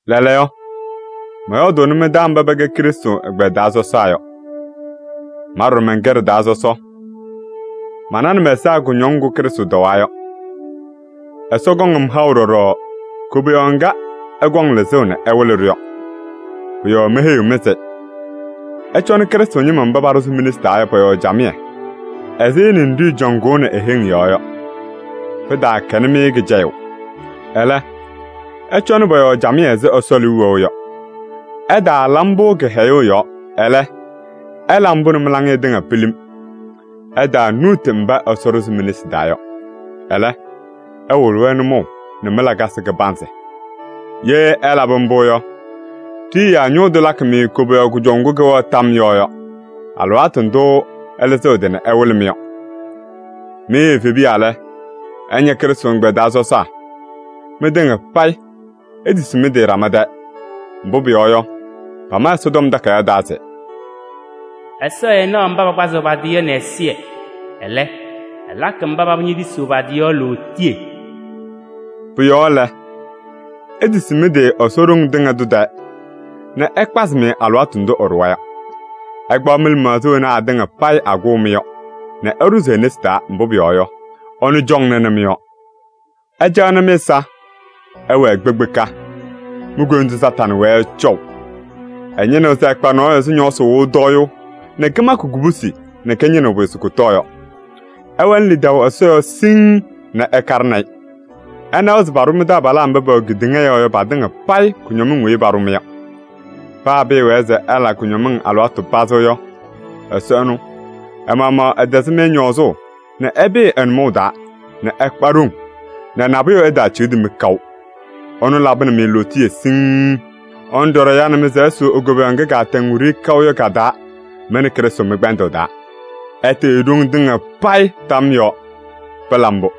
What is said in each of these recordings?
Lɛɛlɛɛyɔ, mɔyɔɔdʋʋnɩ mɩ-taa mba pɛkɛ Krɩstʋ ɛgbɛyɛ taa sɔsaa yɔ. Ma ɖɔɖɔ mɛnkɛ ɖɩ-taa sɔsɔ. Mananɩ mɛ-ɛza kʋñɔŋ ŋgʋ Krɩstʋ tɔwaa yɔ. Ɛsɔ kɔŋ-m haʋ ɖɔɖɔ koboyaɣ ŋga ɛkɔŋ lɩzʋʋ nɛ ɛwɩlɩ-ɖʋ yɔ. Pʋ-yɔɔ meheyiɣ-mɩ se: ɩcɔnɩ Krɩstʋ ñɩma mba Ɛsɔ ɖʋzɩ mi-nesi taa yɔ pɔ-yɔɔ camɩyɛ ɛzɩ ninɖiɣyu cɔŋʋʋnɩ e-heŋ yɔɔ yɔ. Pɩtaakɛnɩ-mɩ kɩcɛyʋʋ. Ɛlɛ, ɩcɔnɩ pɔ-yɔɔ camɩyɛ ɛzɩ Ɛsɔ liu wɛʋ yɔ. Ɩtaala mbʋ kɩhɛyʋʋ yɔɔ, ɛlɛ, ɩla mbʋ nɛ mɩ-laŋɩyɛ tɩŋa pilim. Ɩtaanuuti mba Ɛsɔ ɖʋzɩ mi-nesi taa yɔ. Ɛlɛ, ɩwɩlɩ-wɛ nʋmɔʋ nɛ mɩ-lakasɩ kɩbanzɩ. Ye ɩlabɩ mbʋ yɔ, Ɖiyiyaa Ñʋʋ Tʋ lakɩ-mɩ koboyaɣ kʋjɔʋ ŋgʋ kɩwɛɣ tam yɔɔ yɔ, alɩwaatʋ ndʋ ɛlɩzɩɣ ɛ-tɩ nɛ ɛwɩlɩ-mɩ yɔ. Mɩ evebiya lɛ, ɩña Krɩstʋ ɛgbɛyɛ taa sɔsaa. Mɩtɩŋa payɩ itisi mɩ-tɩ ɖama tɛɛ. Mbʋ pʋyɔɔ yɔ, pama Ɛsɔtɔm Takayaɣ taa se: “Ɛsɔ ɛɛnaɣ mba pakpazɩɣ pa-tɩ yɔ nɛ ɛzɩyɛ. Ɛlɛ, ɛlakɩ mba paba ñetisiɣ pa-tɩ yɔ lootiye.” Pʋ-yɔɔ lɛ, itisi mɩ-tɩ Ɛsɔ ɖoŋ tɩŋa tʋ tɛɛ nɛ ɛkpazɩ-mɩ alɩwaatʋ ndʋ ɛɖʋwa yɔ. Ɩkpaɣ lɩmaɣza wena atɩŋa payɩ akʋʋ-mɩ yɔ nɛ ɩɖʋzɩ e-nesi taa, mbʋ pʋyɔɔ yɔ, ɛnʋ cɔŋnɩnɩ mɩ-yɔɔ. Ɩcaɣnɩ mɩ-ɛza! Ɩwɛɛ kpekpeka! Mi-koyindu Satanɩ wɛɛ ɛcɔʋ. Ɛñɩnɩɣ se ɛkpa nɔɔyʋ ɛzɩ ñɔɔsɩ wɩɣʋ tɔyʋʋ nɛ kɩmakɩ kubusi nɛ kɩñɩnɩɣ pʋyʋ se kʋtɔɔ yɔ. Ɩwɛnɩ lidaʋ Ɛsɔ yɔɔ siŋŋ nɛ ɩkaɖɩnɩ-ɩ. Ɩnawa se paɖʋ mɩ-taabalaa mba pɛwɛ kedeŋa yɔɔ yɔ patɩŋa payɩ kʋñɔmɩŋ weyi paɖʋ-mɩ yɔ. Paa pɩɩwɛɛ se ɩla kʋñɔŋ alɩwaatʋ pazɩ yɔ, Ɛsɔ ɛnʋ ɛ-maɣmaɣ ɛtɛzɩ-mɩ ñɔɔzʋʋ nɛ ɩpɩɩ ɛ-nʋmɔʋ taa nɛ ɩkpa ɖoŋ nɛ nabʋyʋ ɛtaaciɣdi-mɩ kaʋ. Ɛnʋ labɩnɩ-mɩ lootiye siŋŋ. Ɛnʋ ɖɔɖɔ yanɩ-mɩ se ɩsʋʋ e-koboyaɣ ŋga kaatɛŋ wiɖiyi kaʋ yɔ ka-taa mɩ nɛ Krɩstʋ mɩ-kpɛndʋʋ taa. Ɛtɩɣyɩ ɖoŋ tɩŋa payɩ tam yɔɔ! Pɩla mbʋ!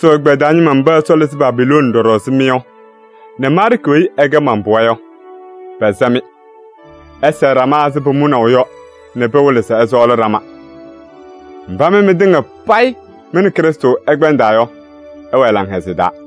Krɩstʋ ɛgbɛyɛ taa ñɩma mba Ɛsɔ lɩzɩ Babilooni ɖɔɖɔ ɛzɩ mɩ yɔ nɛ Maarkɩ weyi ɛkɛ man-pɩɣa yɔ, pɛsɛ-mɩ. Ɩsɛɛ ɖama ɛzɩ pʋmʋnaʋ yɔ nɛ pɩwɩlɩ se ɩsɔɔlɩ ɖama. Mba mɩ mɩtɩŋa payɩ mɩ nɛ Krɩstʋ ɩkpɛndaa yɔ, ɩwɛɛ laŋhɛzɩyɛ taa.